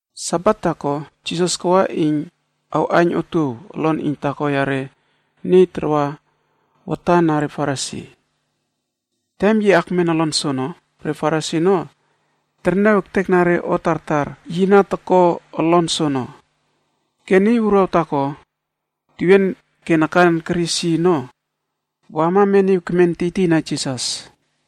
Sabat taako, Jisas kawa iyn awꞌaiyn otuow olon iyn taako yare niy tarwa watan na re Farisi. Tem yi akmen olon soono, re Farisi ono terniaw ektekna re o tartar yi na toko olon soono. Ke niy wuruaw taako tewien ke nakan keris yi ono, wama meniw kemen tiytiyna Jisas.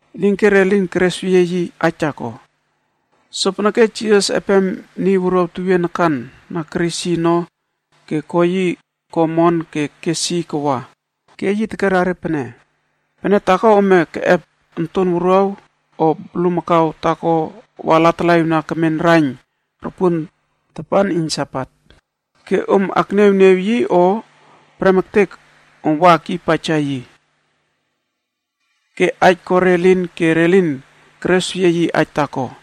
Elinke re lin keresweyie yi aij taako. Sopeneke Jisas epem niy wuruaw tewien nakan na keris yi ono ke ko yi ko omon ke kes yi kawa. Ke yi tekera re pene, “Pene taako ome keꞌep onton wuruaw, o bulmakau taako wa latalaꞌiwna kemen raiyn ropuon tapan iyn Sabat, ke om akniawniaw yi o prem ektek om wa akyiypaija yi?” Ke aij ko re elin ke re lin keresweyie yi aij taako.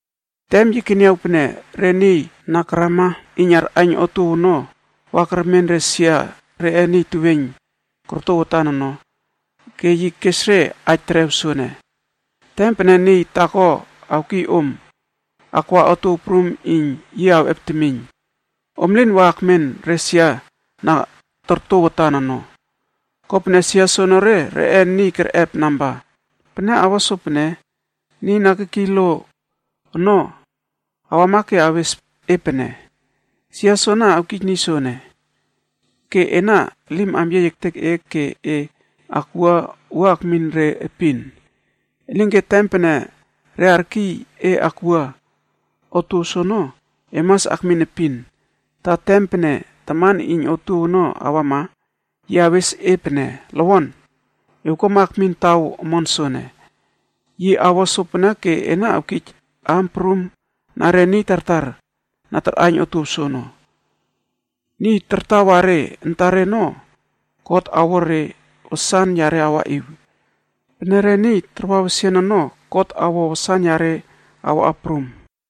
Tem yi keniaw pene re niy na karama iyn arꞌaiyn otuow ono wa kermen re sia reꞌe niy teweiyn korto watan ono, ke yi kes re aij terew soene: “Tem pene niy taako awkiy om akwa otuow prum iyn yi awꞌep temiyn, om lin wa akmen re sia na torto watan ono. Kopene sia soenere reꞌe niy kerꞌep namba. Pene awo sopene, niy na kekiy lo ono awama ke awes e pene, ‘Sia soana awkij niy soene.’ Ke ena elim amyiey ektek e ke e akwua wua akmin re epin. Elinke tem pene re arkiy e akwua otuow soono, e mas akmin epin, ta tem pene taman iyn otuow ono awama, yi awes e pene, ‘Lowon, ewkuama ekmin taw omon soene.’ Yi awo sopene ke ena awkij aam prum na re niy tartar na tarꞌaiyn otuow soono. Niy tartawa re antare ono God awo re wasan yare awaꞌiw. Pene re niy tarwa wesian ono God awo wasan yare awa prum.”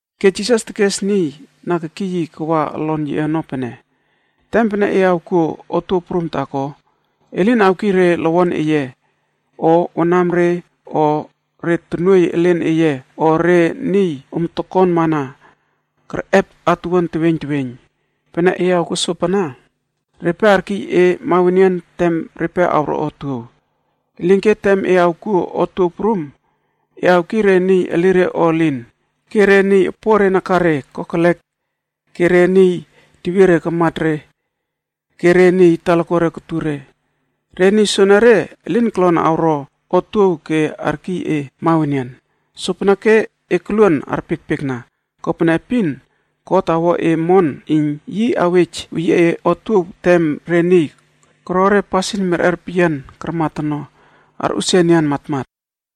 Ke Jisas tekes niy na kekiy yi kawa olon yiꞌe ono pene, “Tem pene e awkuo otuow prum taako, e lin awkiy re lowon eye, o wanamre o re tonuoiy elen eye o re niy om tokonmana kerꞌep atuwuan teweiyn teweiyn. Pene e awkuo sopana, repe arkiy e mawenian tem repe awro otuow. Elinke tem e awkuo otuow prum, e awkiy re niy elire o elin, ke re niy opore nakare kokelek ke re niy tewiere karmat re ke re niy talakuare kotur re. Re niy soenere elin kolon awro otuow ke arkiy e mawenian. Sopeneke e koluon arpiekpiekna, kopene epin God awo e omon iyn yi awej weyie e otuow tem re niy koro re pasin merꞌer peyian karmat ono, arꞌusia enian matmat.”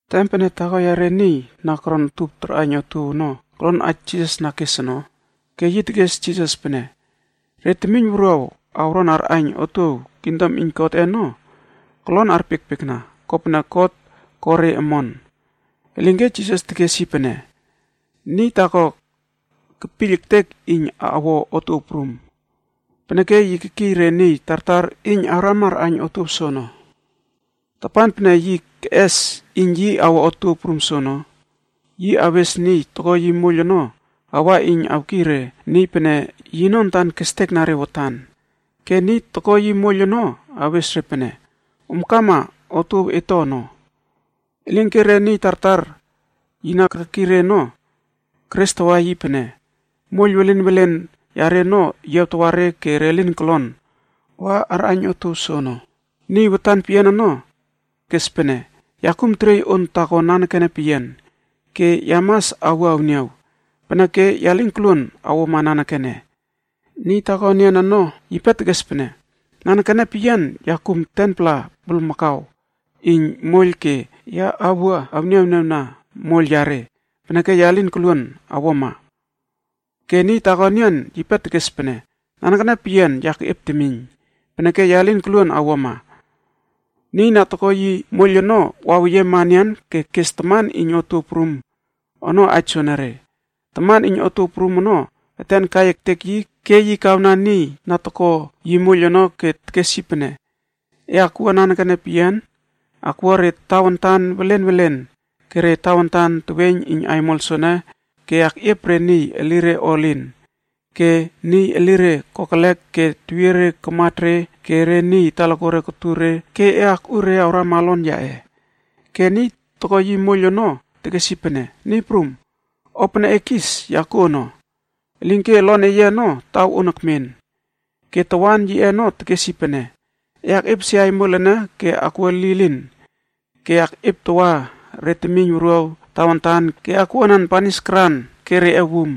Tem pene taako yare niy na koron utup tarꞌaiyn otuow ono kolon aij Jisas na kes ono, ke yi tekes Jisas pene, “Re temiyn wuruaw awron arꞌaiyn otuow kingdom iyn Godꞌe ono, kolon arpiekpiekna, kopene God ko re omon.” Elinke Jisas tekes yi pene, “Niy taako kepiyl ektek iyn awo otuow prum, peneke yi kekiy re niy tartar iyn awrama arꞌaiyn otuow soono. Tapan pene yi keꞌes iyn yi awo otuow prum soono, yi awes niy toko yi moiyl ono awa iyn awkiy re niy pene yino antan kestekna re watan. Ke niy toko yi moiyl ono awes re pene, ‘Om kama, otuow et to ono.’ “Elinke re niy tartar yi na kekiy re ono, kerestawa yi pene moiyl welen welen yare ono yiawtawa re ke re lin kolon wa arꞌaiyn otuow soono. Niy watan peyian ono kes pene, ‘Ya kum teriey on taako nanekene peyian ke ya mas awua awniaw. Peneke ya lin koluon awuama nanekene.’ “Niy taako enian ono, yipe tekes pene, ‘Nanekene peyian ya kum 10-pla bulmakau iyn moiyl ke ya awua awniawniawna moiyl yare. Peneke ya lin koluon awuama.’ “Ke niy taako enian yipe tekes pene, ‘Nanekene peyian ya keꞌiep temiyn, peneke ya lin koluon awuama.’ “Niy na toko yi moiyl ono waweyiema enian ke kes taman iyn otuow prum ono aij soenere. Taman iyn otuow prum ono eten kai ektek yi ke yi kawna niy na toko yi moiyl ono ke tekes yi pene, ‘E akwua nanekene peyian, akwua re tawantan welen welen ke re tawantan teweiyn iyn aimol soene ke akꞌiep re niy elire o elin, ke niy elire kokelek ke tewiere karmat re ke re niy talakuare kotur re ke e akꞌu re awrama olon yaꞌe.’ “Ke niy toko yi moiyl ono tekes yi pene, ‘Niy prum, o pene e kis, ya kuo ono, elinke olon eye ono taw on ekmen.’ “Ke tawan yiꞌe ono tekes yi pene, ‘E akꞌiepesie aimol ene ke akwua lilin ke akꞌieptawa re temiyn wuruaw tawantan ke akwuanan banis karan ke reꞌe wum.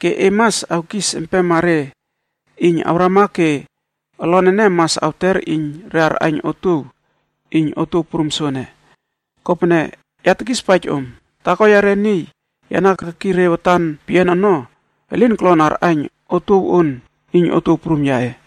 Ke e mas awkis empema re iyn awrama ke olon ene mas awter iyn re arꞌaiyn otuow iyn otuow prum soene. Kopene, ya tekispaij om, taako yare niy ya na kekiy re watan peyian ono, elin kolon awꞌaiyn otuow on iyn otuow prum yaꞌe.’”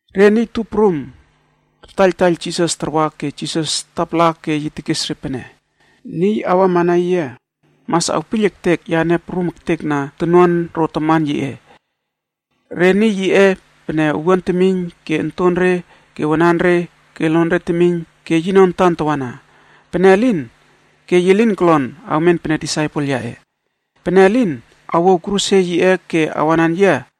Re niy tup prum tartaiyltaiyl Jisas tarwa ke Jisas tapala ke yi tekes re pene: “Niy awama na yia mas awpiyl ektek yane prum ektekna tonuan ro taman yiꞌe, re niy yiꞌe pene owuan temiyn ke ontonre ke wananre ke lonre temiyn ke yino antan tawana. Pene elin, ke yi lin kolon awmen pene disaipel yaꞌe.” Pene niy elin awouw kruse yiꞌe ke awanan yia,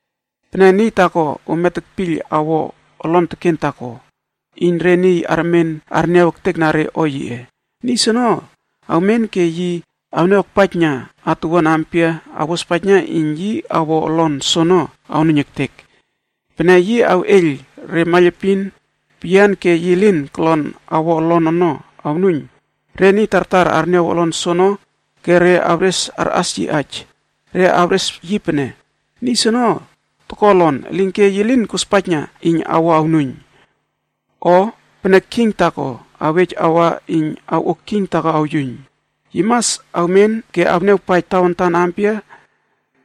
“Pene niy taako ome tekpiyl awo olon teken taako iyn re niy armen arniaw ektekna re o yiꞌe. Niy soono awmen ke yi awniaw akpaijna atuwuan ampia awospaijna iyn yi awo olon soono awnuiyn ektek. Pene yi awꞌeiyl re maiylepin peyian ke yi lin kolon awo olon ono awnuiyn, re niy tartar arniaw olon soono ke re awres arꞌas yi aij. Re awres yi pene, ‘Niy soene toko olon, elinke yi lin kospaijna iyn awo awnuiyn.’ “O pene king taako awej awa iyn awꞌo king taako awyuiyn, yi mas awmen ke awniawpaij tawantan ampia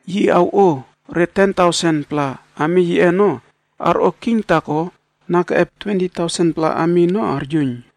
yi awꞌo re ten tausen-pla ami yiꞌe ono arꞌo king taako na keꞌep twenti tausen-pla ami ono aryuiyn.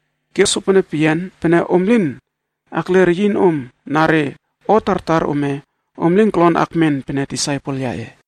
Ke sopono peyian, pene om lin akle reyinom na re o tartar ome, om lin kolon akmen pene disaipel yaꞌe.”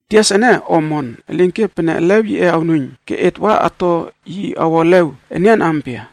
“Tias ene o omon, elinke pene elew yiꞌe awnuiyn ke et wa ato yi awo elew enian ampia?